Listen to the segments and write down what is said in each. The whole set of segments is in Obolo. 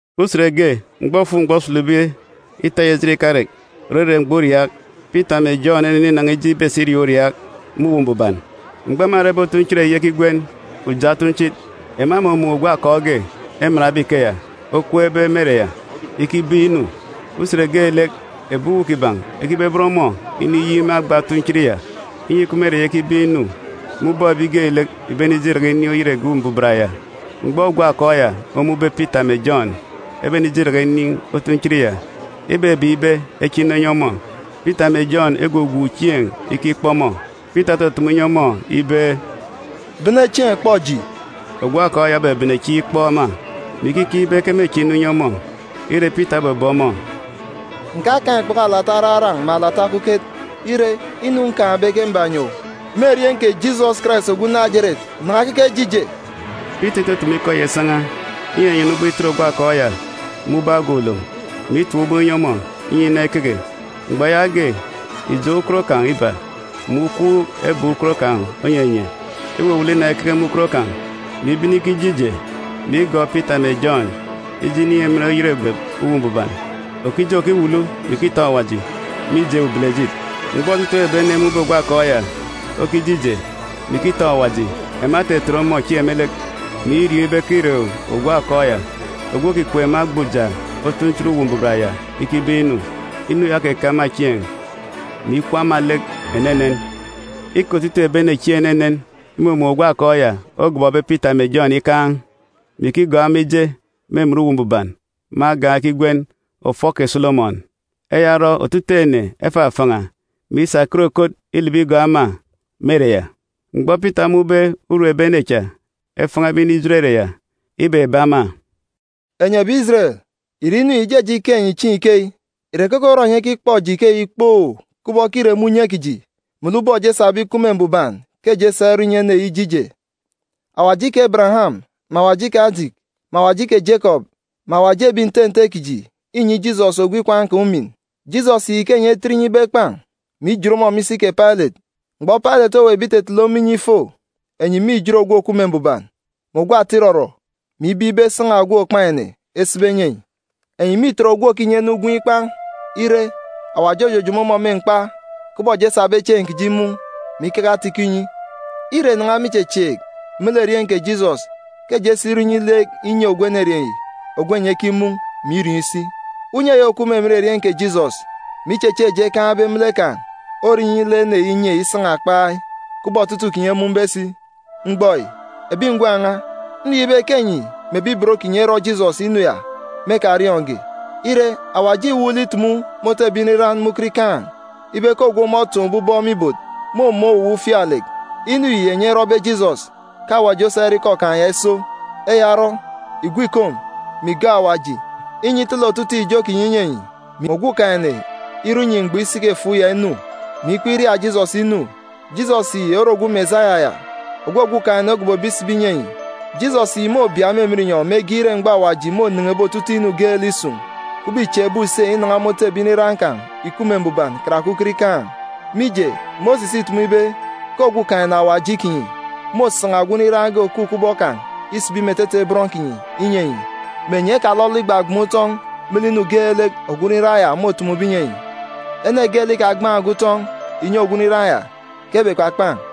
Usen ge, mgbọ òfuk-mgbọ osulube ita eyi ejit ikarek, òrere mgbọ uriaak, Pita mè Jọn eneninan̄a ije ibesi iriaak uriaak me Uwu Mbuban. Mgbọ ema erebe otunchit eyi ekigwen Uja Otunchit, ema emumun̄ ogwu akọọk ge, emanbe ikeya, okweekbe me ere ya ikibeek inu. Usen geelek, ebi uwu kiban̄ ekibeben ọmọ iniyik me agba otunchit ya, inyi ikup me ere ya ikibeek inu me ubọk ebi geelek ìbenije iraka inin̄ oyet egep Uwu Mbuban ya. Mgbọ ogwu akọọk ya omun̄be Pita mè Jọn ebenije iraka inin̄ otunchit ya, ibebeek ibe eche inu enyi ọmọ. Pita mè Jọn egwugwuun̄ chieen̄ ikikpọ ọmọ. Pita otutumu inyi ọmọ ibe, “Bene chieen̄ kpọ eji!” Ogwu akọọk ya obebene chieen̄ ikpọ ema, mè ikikeek ibe ke mêche inu inyi ọmọ. Ire, Pita obebe ọmọ, “Ǹkakaan̄ ikpoko alata araran̄ mè alata okuket. Ire, inu nkaan̄be ke mbanyi owu. Me erieen̄ kè Jisọs Karais ogwu Najeret, nan̄a keke je ije!” Pita itutumu ikọ ya isan̄a, inyanyana ubọk itet ogwu akọọk ya me ubọk agan̄ ulom, mè itap ubọk inyi ọmọ, inyi inan̄a ikeke. Mgbọ yaage, ijọn̄ ukot kan̄ iba mè ukwuuk ebek ukot kan̄ onyenye. Iwuwulu inan̄a ikeke me ukot kan̄, mè ibene ikije ije, mè igọọk Pita mè Jọn ije inin̄ emen oyet egep Uwu Mbuban. Òkije, òkiwulu, mè ikitọn̄ Awaji, mije ubelejit. Mgbọ otutuuk ebi ene emun̄be ogwu akọọk ya okije ije, mè ikitọn̄ Awaji, ema etetet ọmọ chieen̄ me lek, mè iriọọn̄ ibe ke îre ogwu akọọk ya, ogwu òkikweek me agba Uja Otunchit Uwu Mbuban ya ikibeek inu. Inu ya okeke ema chieen̄, mè ikwu ema lek enenen. Îke otutuuk ebi ene chieen̄ enenen imumun̄ ogwu akọọk ya ogọbọbe Pita mè Jọn ikaan̄, mè ikigọọk ema ije me emen Uwu Mbuban me agan̄ ekigwen, ọfọ kè Solomọn. Eya orọ, otutuuk ene efafan̄a, mè isa ekot ekot ilibi igọọk ema me ere ya. Mgbọ Pita omun̄be urum ebi ene cha efan̄abe inijot ere ya, ibebe ema, “Enyi ebi Ijeren, ìre inu yi ìjeje ike enyi chieen̄ ikeyi? Ìre keke orọ enyi ekikpọ eji ikeyi kpoo kubọk ke îre me unye kiji melek ubọk eji esabe ikup me mbuban ke eji esa irọ inyi ene yi ije ije? Awaji kè Ebereyam, mè Awaji kè Ajiki, mè Awaji kè Jekọp, mè Awaji ebi nte nte kiji înyi Jisọs ogwu ikwaan̄ kan̄ umin. Jisọs yi ke enyi etet inyi ibe ekpan̄, mè ijit ọmọ me isi kè Pailet, mgbọ Pailet oweekbe itetele ọmọ inyi ifo. Enyi mîjit Ogwu Òkup me Mbuban mè ogwu Ata Irọrọ, mè ibeek ibe esan̄a ogwu òkpan̄ ene esibi enyi enyi. Enyi mîtet ogwu òkinyi ene ugwem ikpan̄. Ire, Awaji ojojomo ọmọ me mkpa, kubọk eji esabe chieen̄ kiji imun̄, mè ikeke ata-ikọ inyi. Îre nan̄a me ichechieek me lek erieen̄ kè Jisọs ke eji esa irọ inyi lek inye ogwu enerieen̄ yi ogwu enyi ekimun̄, mè iriọọn̄ isi. Unye eyi òkup me emen erieen̄ kè Jisọs, mè ichechieek eji ekaan̄be me lek kan̄ orọ inyi lek ene yi inye isan̄a kpai, kubọk otutuuk kinyi emun̄be si. “Mgbọ yi, ebi ngwan̄ n̄a, nriọọn̄ ibe ke enyi mè ebi ibot kinyi erọ Jisọs inu ya me ekariọọn̄ge. Ire, Awaji îwuuk lek itumu me otu ebi nriran me ukot ikaan̄ ibe ke ogwu ọmọ otọkọbe aran̄ me ibot mômun̄ owuwa ufialek. Inu yi enyi erọbe Jisọs ke Awaji osa irọ ikọ kan̄ ya iso. Eya orọ, ìgwu ìkom, mè ìgọọk Awaji, inyi itele otutuuk ijo kinyi inyi enyi, mè Okumugwem irọ inyi mgbọ isiki-efuuk ya inu, mè ikpọk iria Jisọs inu. Jisọs yi ore ogwu Mesaya ya, ogwu Okumugwem ogobobe isibi inyi enyi. Jisọs yi môbia me emen inyọn̄ mege ire mgbọ Awaji mônen̄ebe otutuuk inu geelek isun̄, kubọk îchieekbe use inan̄a me otu ebi nriran kan̄ ìkup me mbuban karake ukot ikaan̄. Mije, Mosis îtumu ibe ke Okumugwem Awaji kinyi môsan̄a ogwu nriran ge òkup kubọk kan̄ isibi me etete bọn kinyi inyi enyi, mè enyi ekalọlọ igbagban̄ utọn̄ me lek inu geelek ogwu nriran ya môtumube inyi enyi. Ene geelek ikagban̄ge utọn̄ ìnyi ogwu nriran ya, ke ebekpakpan̄,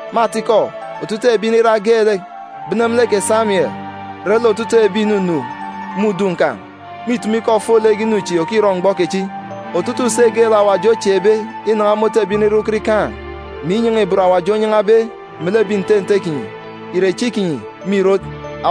Me atikọ, otutuuk ebi nriran geelek, bene me lek kè Samien re lek otutuuk ebi ìnunu me udun̄ kan̄, mîtumu ikọ ofolek inu chi òkirọ mgbọ kechi. Otutuuk use geelek Awaji ochieekbe inan̄a me otu ebi nriran ukot ikaan̄, mè inyan̄a-ibot Awaji onyan̄abe melek ebi nte nte kinyi, ìre echi kinyi me ìrot.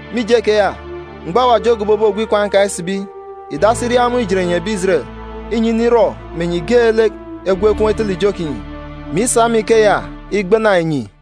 Mije keya, mgbọ Awaji ogobobe ogwu ikwaan̄ kan̄ isibi, ìdasi iria ọmọ ijet enyi ebi Ijeren, inyi inirọ mè enyi geelek egwu ekom etele ijo kinyi, mè isa me ikeya igbana enyi.”